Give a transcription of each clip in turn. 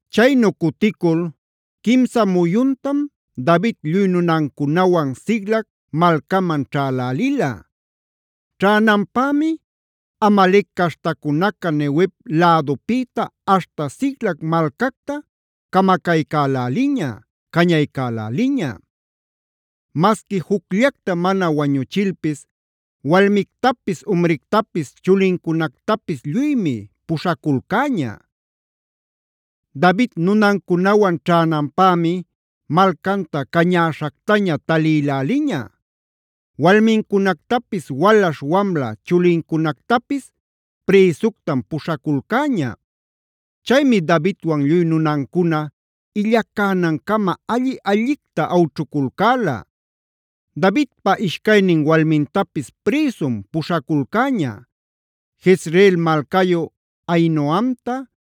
Chaynu cuticul quimsa muyuntam David lluy nunancunawan Siclag malcaman ćhälälila. Ćhänanpämi Amalec caśhtacunaca Neguev lädupïta aśhta Siclag malcacta camacaycäläliña, cañaycäläliña. Masquiae jucllacta mana wañuchilpis walmictapis, umrictapis, chulincunactapis lluymi puśhaculcäña. David nunancunawan ćhänanpämi malcanta cañäśhactaña talïläliña. Walmincunactapis walaśh wamla chulincunactapis prïsuctam puśhaculcäña. Chaymi Davidwan lluy nunancuna illacänan-cama alli-allicta awćhuculcäla. Davidpa ishcaynin walmintapis prïsum puśhaculcäña: Jezreel malcayu Ahinoamta,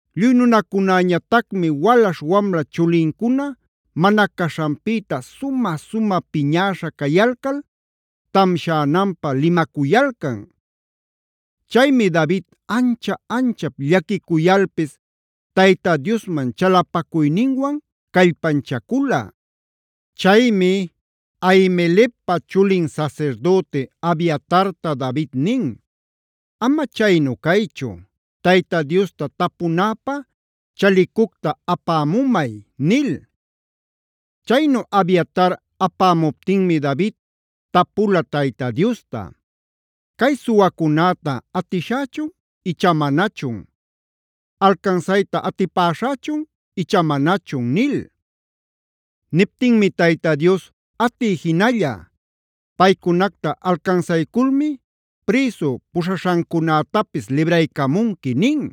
Lluy nunacunäñatacmi walaśh wamla chulincuna mana caśhanpïta sumä-sumä piñäśha cayalcal tamshänanpä limacuyalcan. Chaymi David ancha-anchap llaquicuyalpis Tayta Diosman chalapacuyninwan callpanchacula. Chaymi Ahimelecpa chulin sasirdüti Abiatartab David nin: “Ama chaynu caychu, Tayta Diosta tapunäpä chalicucta apämumay” nil. Chaynu Abiatar apämuptinmi David, tapula Tayta Diosta: “¿Cay suwacunäta atishächun icha manachun? ¿Alcansayta atipaśhächun icha manachun?” nil. Niptinmi Tayta Dios: “Atiy jinalla. Paycunacta alcansayculmi prïsu puśhaśhancunätapis libraycamunqui” nin.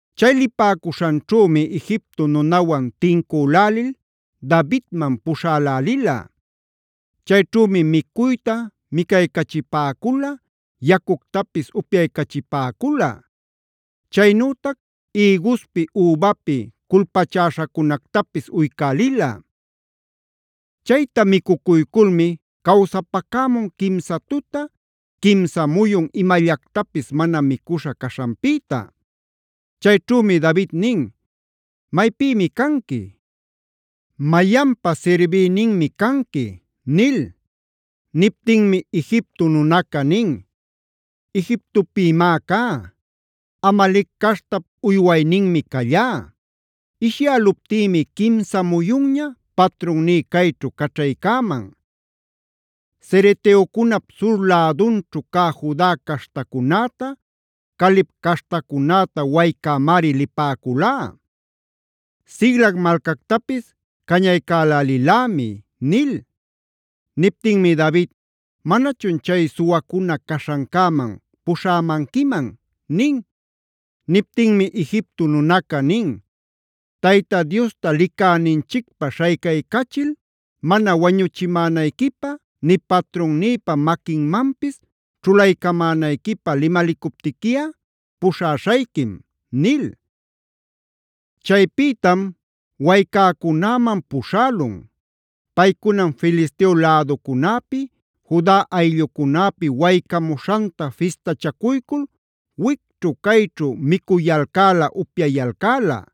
Chay lipäcuśhanćhümi Egipto nunawan tincülälil Davidman puśhälälila. Chayćhümi micuyta micaycachipäcula, yacuctapis upyaycachipäcula. Chaynütac ïguspi, übapi culpachäśhacunactapis uycälila. Chayta micucuyculmi cawsapacämun quimsa tuta, quimsa muyun imallactapis mana micuśha caśhanpïta. Chayćhümi David nin: “¿Maypïmi canqui? ¿Mayanpa sirbïninmi canqui?” nil. Niptinmi Egipto nunaca nin: “Egiptopïmi cá. Amalec caśhtap uywayninmi callá. Ishyäluptïmi quimsa muyunña patrunní cayćhu caćhaycäman. Cereteocunap sur lädunćhu cä Juda caśhtacunäta, Caleb caśhtacunäta waycämari lipäculá. Siclag malcactapis cañaycälälilämi” nil. Niptinmi David: “¿Manachun chay suwacuna caśhancäman puśhämanquiman?” nin. Niptinmi Egipto nunaca nin: “Tayta Diosta licäninchicpä śhaycaycachil mana wañuchimänayquipä nï patrunnïpa maquinmanpis ćhulaycamänayquipä limalicuptiquiꞌa puśhaśhayquim” nil. Chaypïtam waycäcunäman puśhälun. Paycunam Filisteo läducunäpi, Juda ayllucunäpi waycamuśhanta fistachacuycul wicćhu cayćhu micuyalcäla, upyayalcäla.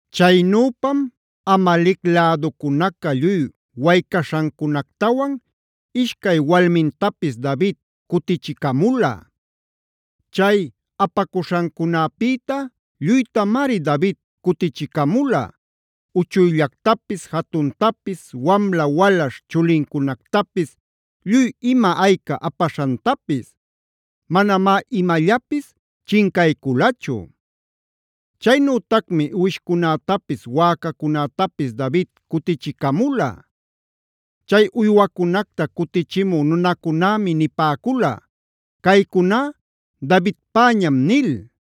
Chaynüpam Amalec läducunaca lluy waycaśhancunactawan ishcay walmintapis David cutichicamula. Chay apacuśhancunäpïta lluytamari David cutichicamula: uchuyllactapis jatuntapis, wamla walaśh chulincunactapis, lluy ima ayca apaśhantapis. Manamá imallapis chincayculachu. Chaynütacmi uwishcunätapis, wäcacunätapis David cutichicamula. Chay uywacunacta cutichimü nunacunämi nipäcula: “Caycuná Davidpäñam” nil.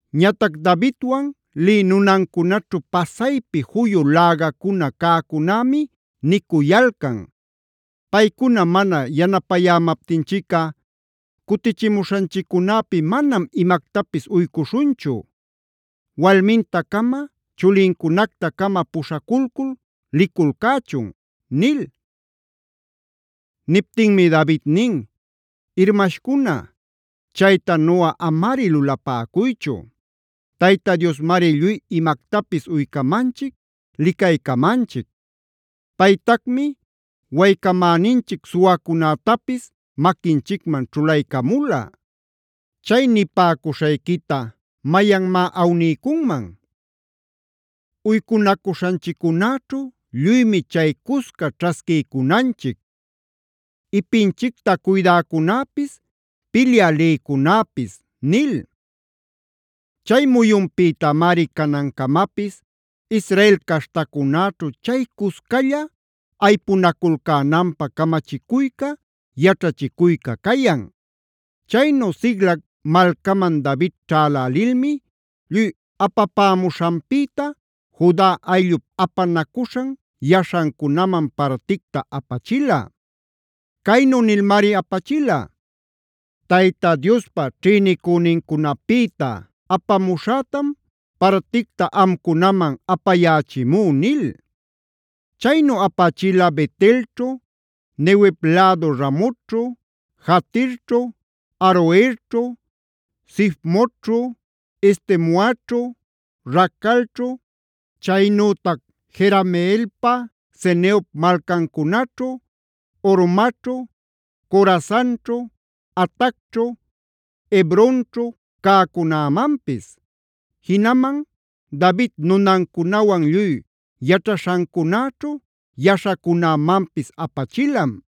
Ñatac Davidwan lï nunancunaćhu pasaypi juyu lägacuna cäcunämi nicuyalcan: “Paycuna mana yanapayämaptinchicꞌa cutichimuśhanchiccunäpi manam imactapis uycuśhunchu. Walminta-cama chulincunacta-cama puśhaculcul liculcächun” nil. Niptinmi David nin: “Irmashcuna, chaytanuꞌa amari lulapäcuychu. Tayta Diosmari lluy imactapis uycamanchic, licaycamanchic. Paytacmi waycamäninchic suwacunätapis maquinchicman ćhulaycamula. ¿¡Chay nipäcuśhayquita mayanmá awniycunman!? Uycunacuśhanchiccunäćhu lluymi chay cusca ćhasquiycunanchic: ipinchicta cuydäcunäpis, pilyä lïcunäpis” nil. Chay muyunpïtamari canancamapis Israel caśhtacunäćhu chay cuscalla aypunaculcänanpä camachicuyca, yaćhachicuyca cayan. Chaynu Siclag malcaman David ćhälälilmi lluy apapämuśhanpïta Juda ayllup apanacuśhan yaśhancunaman particta apachila. Caynu nilmari apachila: Tayta Diospa ćhïnicünincunapïta apamuśhätam particta amcunaman apayächimú” nil. Chaynu apachila Bet-elćhu, Neguev lädu Ramotćhu, Jatirćhu, Aroerćhu, Sifmotćhu, Estemoaćhu, Racalćhu, chaynütac Jerameelpa, ceneop malcancunaćhu, Hormaćhu, Corasanćhu, Atacćhu, Hebronćhu cäcunämanpis; jinaman David nunancunawan lluy yaćhaśhancunäćhu yaśhacunämanpis apachilam.